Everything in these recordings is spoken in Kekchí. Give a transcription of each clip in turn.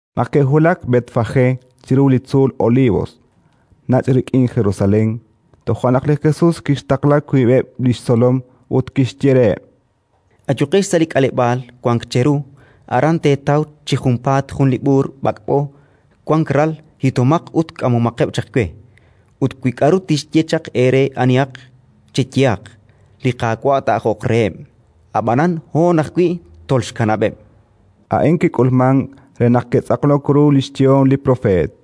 Naq ke'wulak Betfagé chiru li tzuul Olivos, nach' rik'in Jerusalén, toja' naq li Jesus kixtaqla wiib'eb' li xtzolom ut kixye reheb': —Ayuqex sa' li k'aleb'aal wank cheru. Aran teetaw chi junpaat jun li b'uur b'ak'b'o, wank ral; hitomaq ut k'amomaqeb' chaq we. Ut wi k'aru tixye chaq eere anihaq, cheyehaq: «Li Qaawa' taa'ajoq reheb', ab'anan hoon ajwi' tolxkanab'eb'». A'in kik'ulmank re naq kitz'aqlok ru li xyehom li propeet: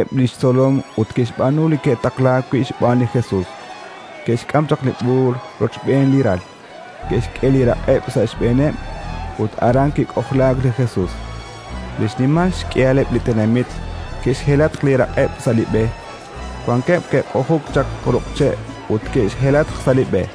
Koheb' li xtzolom ut ke'xb'aanu li ke'taqlaak wi' xb'aan li Jesus: ke'xk'am chaq li b'uur rochb'een li ral, ke'xk'e li raq'eb' sa' xb'eeneb', ut aran kik'ojlaak li Jesus. Li xnimal xk'ihaleb' li tenamit ke'xhelatq li raq'eb' sa' li b'e; wankeb' ke'q'ujuk chaq ruq' che' ut ke'xhelatq sa' li b'e.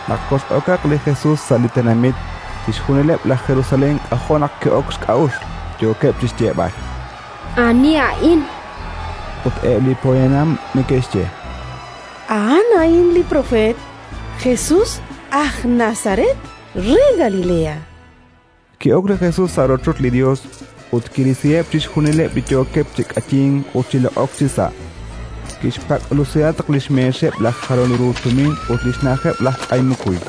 Naq kox'okaq li Jesus sa' li tenamit, chixjunileb' laj Jerusalén k'ajo' naq ke'ok xk'a'uxl, yookeb' chi xyeeb'al: —Ani a'in? Ut eb' li poyanam neke'xye: —A'an a'in li propeet Jesus aj Nazaret re Galilea. Ki'ok li Jesus sa' rochoch li Yos ut kirisiheb' chixjunileb' li yookeb' chi k'ayink ut chi loq'ok chisa'. Kixpak'lusihatq li xmeexeb' laj jalol ru tumin ut li xna'ajeb' laj k'ay mukuy.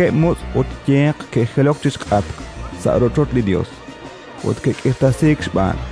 Wankeb' mutz' ut yeq ke'jilok chi xk'atq, sa' rochoch li Yos, ut ke'k'irtasiik xb'aan.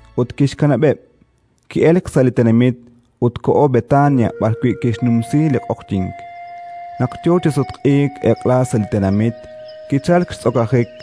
Ut kixkanab'eb': ki'elk sa' li tenamit ut koho Betania b'arwi' kixnumsi li q'oqyink. Naq yo chi sutq'iik eq'la sa' li tenamit, kichalk xtz'okajik.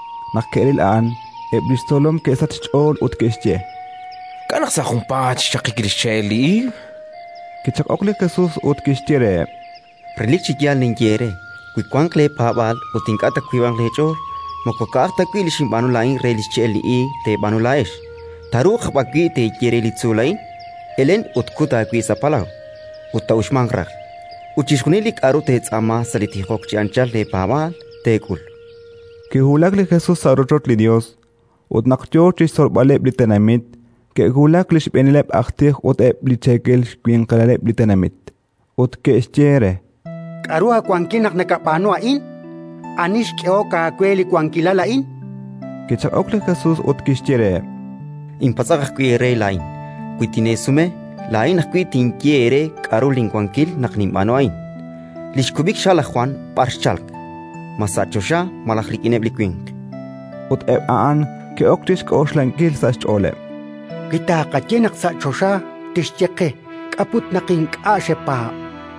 Naq ke'ril a'an, eb' li xtzolom ke'sachk xch'ool ut ke'xye: —K'a' naq sa' junpaat xchaqik li xche'el li iig? Kichaq'ok li Jesus ut kixye reheb': —Relik chi yaal ninye eere: wi wanq leepaab'aal ut ink'a' taawiib'anq leech'ool, moko ka'aj ta wi' li xinb'aanu laa'in re li xche'el li iig teeb'aanu laa'ex, taaruuq aj b'an wi' teeye re li tzuul a'in: «Elen ut kut aawib' sa' palaw», ut taa'uxmanq raj. Ut chixjunil li k'aru teetz'aama sa' li tijok chi anchal eepaab'aal, teek'ul. Kiwulak li Jesus sa' rochoch li Yos. Ut naq yo chi xtzolb'aleb' li tenamit, ke'wulak li xb'eenileb' aj tij ut eb' li xcheekel winqilaleb' li tenamit, ut ke'xye re: —K'aru aawankil naq nakab'aanu a'in? Ani xk'ehok aawe li wankilal a'in? Kichaq'ok li Jesus ut kixye reheb': —Inpatz'aq ajwi' eere laa'in. Wi tineesume, laa'in ajwi' tinye eere k'aru linwankil naq ninb'aanu a'in. Li xkub'iha' laj Jwan b'ar xchalk? Ma sa' choxa malaj rik'ineb' li winq? Ut eb' a'an ke'ok chi xk'oxlankil sa' xch'ooleb': “Wi tqaye naq sa' choxa, tixye qe: «K'a' put naq ink'a' xepaab'?».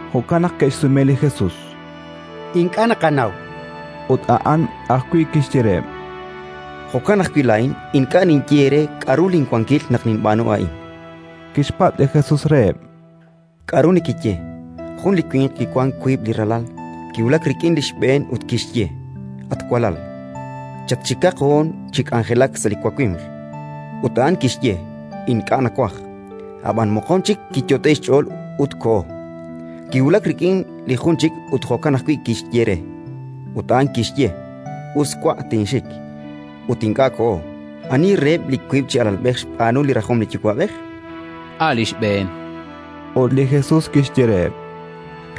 Jo'kan naq ke'xsume li Jesus: —Ink'a' naqanaw, chankeb' re. Ut a'an ajwi' kixye reheb': —Jo'kan ajwi' laa'in ink'a' ninye eere k'aru linwankil naq ninb'aanu a'in. Kixpatz' li Jesus reheb': —K'aru nekeye? Jun li winq kiwank wiib' li ralal. Kiwulak rik'in li xb'een ut kixye: «At walal, chatxikaq hoon chi k'anjelak sa' li wawimq». Ut a'an kixye: «Ink'a' nawaj». Ab'an moqon chik kiyot'e'k xch'ool ut koho. Kiwulak rik'in li jun chik ut jo'kan ajwi' kixye re. Ut a'an kixye: «Us, wa'; tinxik»; ut ink'a' koho. Ani reheb' li wiib' chi alalb'ej xb'aanu li rajom li yuwa'b'ej? —A' li xb'een, chankeb'. Ut li Jesus kixye reheb':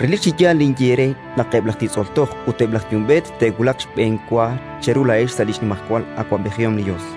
—Relik chi yaal ninye eere naq eb' laj titz'ol toj ut eb' laj yumb'eet te'wulaq xb'enwa cheru laa'ex sa' li xnimajwal awab'ejihom li Yos.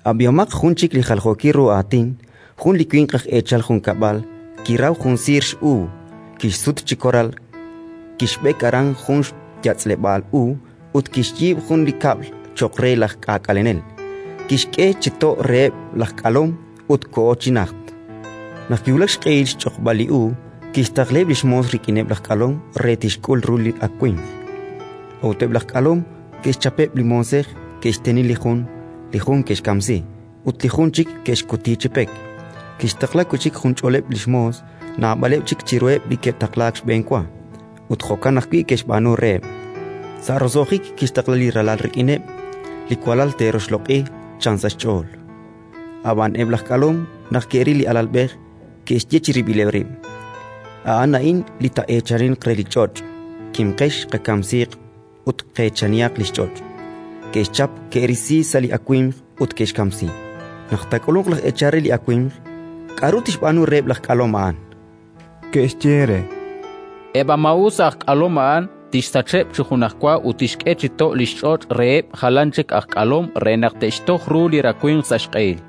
“Ab'ihomaq jun chik li jaljookil ru aatin. Jun li winq aj eechal junkab'al kiraw jun siir x'uub', kixsut chi koral, kixb'ek aran jun xyatz'leb'aal uub' ut kixyiib' jun li kab'l cho'q re laj k'aak'alenel; kixk'e chi to' reheb' aj k'alom ut koho chi najt. Naq kiwulak xq'ehil xchoqb'al li uub', kixtaqlaheb' li xmoos rik'ineb' laj k'alom re naq tixk'ul ru li rawimq. A'ut eb' laj k'alom ke'xchapeb' li moosej: ke'xteni li jun, li jun ke'xkamsi, ut li jun chik ke'xkuti chi pek. Kixtaqla wi' chik junch'oleb' li xmoos, naab'aleb' chik chiruheb' li ke'taqlaak xb'enwa; ut jo'kan ajwi' ke'xb'aanu reheb'. “Sa' roso'jik kixtaqla li ralal rik'ineb': «Li walal te'roxloq'i», chan sa' xch'ool. Ab'an eb' laj k'alom, naq ke'ril li alalb'ej, ke'xye chirib'ileb' rib': «A'an a'in li taa'eechaninq re li ch'och'. Kimqex, qakamsiiq ut qeechanihaq li xch'och'». Ke'xchap, ke'risi sa' li awimq ut ke'xkamsi. “Naq taak'ulunq laj eechal re li awimq, k'aru tixb'aanu reheb' aj k'alom a'an?”. Ke'xye re: —Eb' a maa'us aj k'alom a'an tixsacheb' chi junajwa ut tixk'e chi to' li xch'och' reheb' jalan chik aj k'alom re naq te'xtoj ru li rawimq sa' xq'ehil.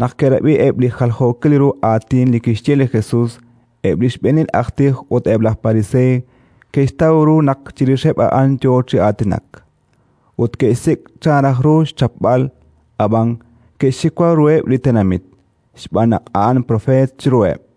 Naq ke'rab'i eb' li jaljookil ru aatin li kixye li Jesus, eb' li Xb'eenil aj tij ut eb' laj Pariseey ke'xtaw ru naq chirixeb' a'an yo chi aatinak. Ut ke'xsik' chan raj ru xchapb'al, ab'an ke'xxiwa ruheb' li tenamit, xb'aan naq a'an propeet chiruheb'.